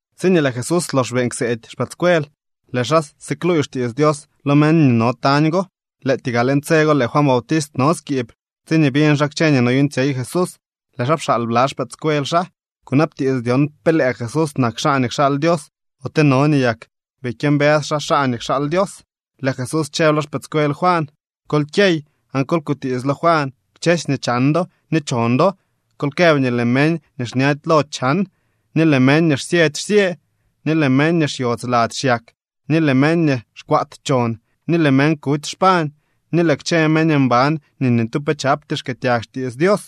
Tsiñee lëë Jesús lox beeñ kseedy xpëëdscuel, lëë xaa sikluuy xtiits Dios lo meñ nii no tañ go. Lëëtyee gaa leñ tse go lëë Juan Bautist no skiib tsiñee biñ xaa kchë nii noyuuñtsyey Jesús. Lëë xaa pxaal bla xpëëdscuel xaa kunabtiits dyon pe lëë Jesús nak xaa nii kxaal Dios ote no nii yak bii kyëmbës xaa xaa nii kxaal Dios. Lëë Jesús chëb lo xpëëdscuel Juan: —Kol kyey aan kol kutiits lo Juan kchësy nii chan do ni chon do. Kol këb nii lëë meñ nii xñady lo chan, ni lëë meñ nii xsyëdy xsyë, ni lëë meñ nii xyodz lady xyak, ni lëë meñ nii xkwaat chon, ni lëë meñ kuty xpañ, ni lëë kchë meñ mban nii ni tu pe chapty xkëëtyag xtiits Dios.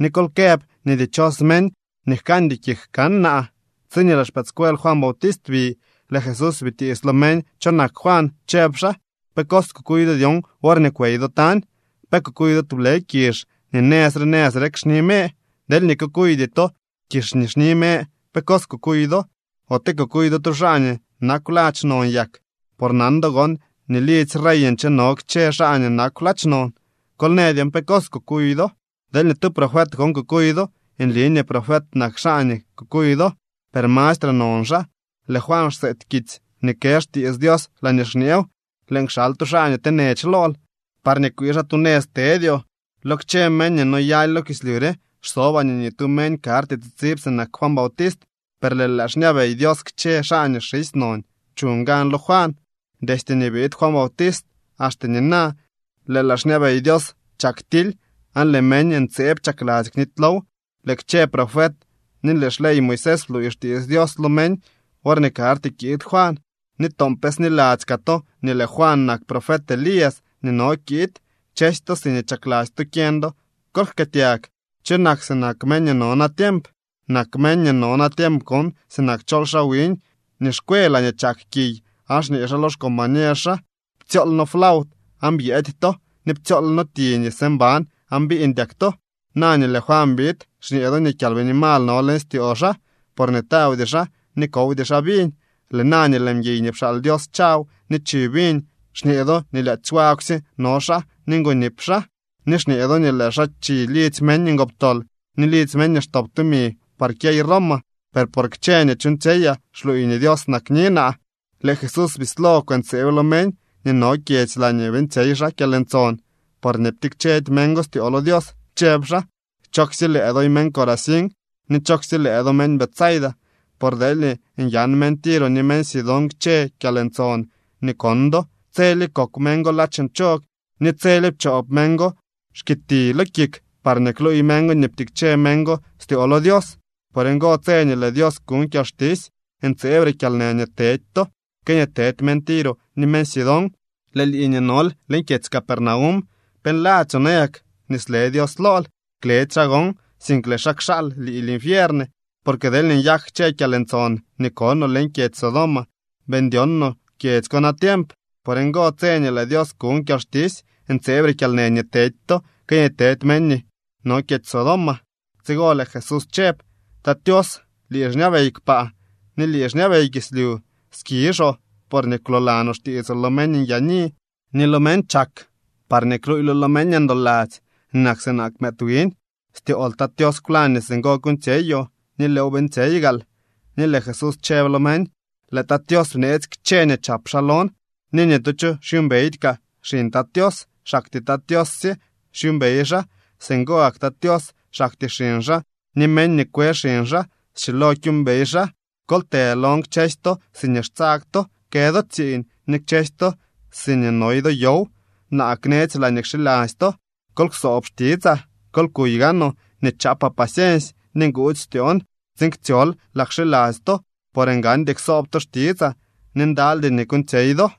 Ni kol këb nii dichos meñ nii jkandy kik kan naa. Tsiñee lëë xpëëdscuel Juan Bautist bi, lëë Jesús bitiits lo meñ cho nak Juan, chëb xaa: —¿Pe cos kukuy do dyon worñee kwey do tañ? ¿Pe kukuy do tublë kizh nii nëz re nëz rek xni me? Deelñee kukuydy to kizh nii xni me, ¿pe cos kukuy do? Ote ¿kukuy do tu xaa nii nakw ladx non yak? Por nan do gon nii lidzy rey ncheno kchë xaa nii nakw ladx non. Kol në dyon pe cos kukuy do. Deelñee tu profet gon kukuy do, nli nii profet nak xaa nii kukuy do, per mastre non xaa. Lëë Juan xseety kitsy nii kë xtiits Dios laañee xñeew: Lëën kxal tu xaa nii tenech lool, parñee kwii xaa tu nëz tedyoo. ’Lo kchë meñ nii noyaly lo kislyu re xsobaa nii ni tu meñ karty tsitsib sinak Juan Bautist, per lëë laa xñabey Dios kchë xaa nii xisy non chuñ gan lo Juan. ’Destye nii biid Juan Bautist axte nina, lëë laa xñabey Dios chak tily, aan lëë meñ ntseeb chakladzy knitylow. Lëë kchë profet ni lëë xley Moisés bluuy xtiits Dios lo meñ worñee karty kiid Juan. Ni toon pe sniladzy kaa to nii lëë Juan nak profet Elías nii no kiid. Kchësy to siñee chakladzy to kyeñ do, kol jkëëtyag. ’¿Cho nak sinak meñ nii no natiemp? Nak meñ nii no natiemp gon sinak chol xaa wiñ nii xkwe laañee chak kiy aan xñee xaa lo xcombañer xaa: “Ptsyool noo flaut aan byëëdy to, ni ptsyool noo ti nii së mban aan biiñdyak to.” Na nii lëë Juan biid, xñee do nii kyalbini mal no leñ styoo xaa, porñee tawdy xaa ni kowdy xaa viñ. Lëë na nii lëë mguiy nii pxaal Dios chaw ni chi viñ, xñee do nii lyaadzy wagwsye no xaa ni ngonip xaa, ni xñee do nii lëë xaa chi lidzy meñ ngoptol ni lidzy meñ nii xtop tumi par kyey Roma. Per por kchë nii chuuñtsyeyaa xluuy nii Dios nakni naa. Lëë Jesús bislo kwëntseeb lo meñ nii no kchë kyedzy laañee beeñtsyey xaa kyalntson, porñee ptikchedy meñ go styoo lo Dios. Chëb xaa: —¡Chooksye lëë doy meñ Corazín ni chooksye lëë do meñ Betsaida! Por deelñee nyan meñ Tiro ni meñ Sidón kchë kyalntson nii kon do, tselye kokw meñ go ladx nchog ni tselye pchoop meñ go xkiti lo kik parñee kluuy meñ go nii ptikche meñ go styoo lo Dios. Por ngo, tse nii lëë Dios kuñ kyalxtisy ntseebre kyalnë nii tedy to que nii tedy meñ Tiro ni meñ Sidón. Lëë lii nii nol leñ kyedzy Capernaum, ¿pe nladzyoo nayak nii sle Dios lool? Kledy xaa gon, sink lëë xaa kxaal lii linfiern. Porque deelñee nyak kchë kyalntson nii konoo leñ kyedzy Sodoma, bii ndyon no kyedzy ko natiemp. Por ngo, tse nii lëë Dios kuñ kyalxtisy ntseebre kyalnë nii tedy to que nii tedy meñ nii no kyedzy Sodoma. Tsigo lëë Jesús chëb: —Tat Tios, lii xñabey kpaa ni lii xñabey kislyu. Skizhoo porñee kwloolanoo xtiitsoo lo meñ nyaani ni lo meñ chak parñee kluuylo lo meñ ndoladzy nii nak sinak mëëd wiñ. Styool, Tat Tios, kwlañ nii singo kuuñtsyeyoo ni lëëw beeñtsyey gaal. Ni lëë Jesús chëb lo meñ: —Lëë Tat Tios bneetsy kchë nii chap xaa lon ni ni tu cho xyuumbeydy kaa xiñ Tat Tios, xaktyee Tat Tios sye xyuumbey xaa. Singo gak kaa Tat Tios, xaktyee xiñ xaa ni meñ nii kwe xiñ xaa schilo kyuumbey xaa. Kol të lon kchësy to siñee xtsag to kë do tsiiñ ni kchësy to siñee noy do yow. Naa knetsy laañee kxiladzy to. Kol ksoob xtitsaa. Kol kuy gaanoo nii chaapaa paciensy ni nguudzy styoon tsiin ktsyol laa kxiladzy to. Por ngandy ksoob to xtitsaa ni ndalydy nii kuuñtsyey do.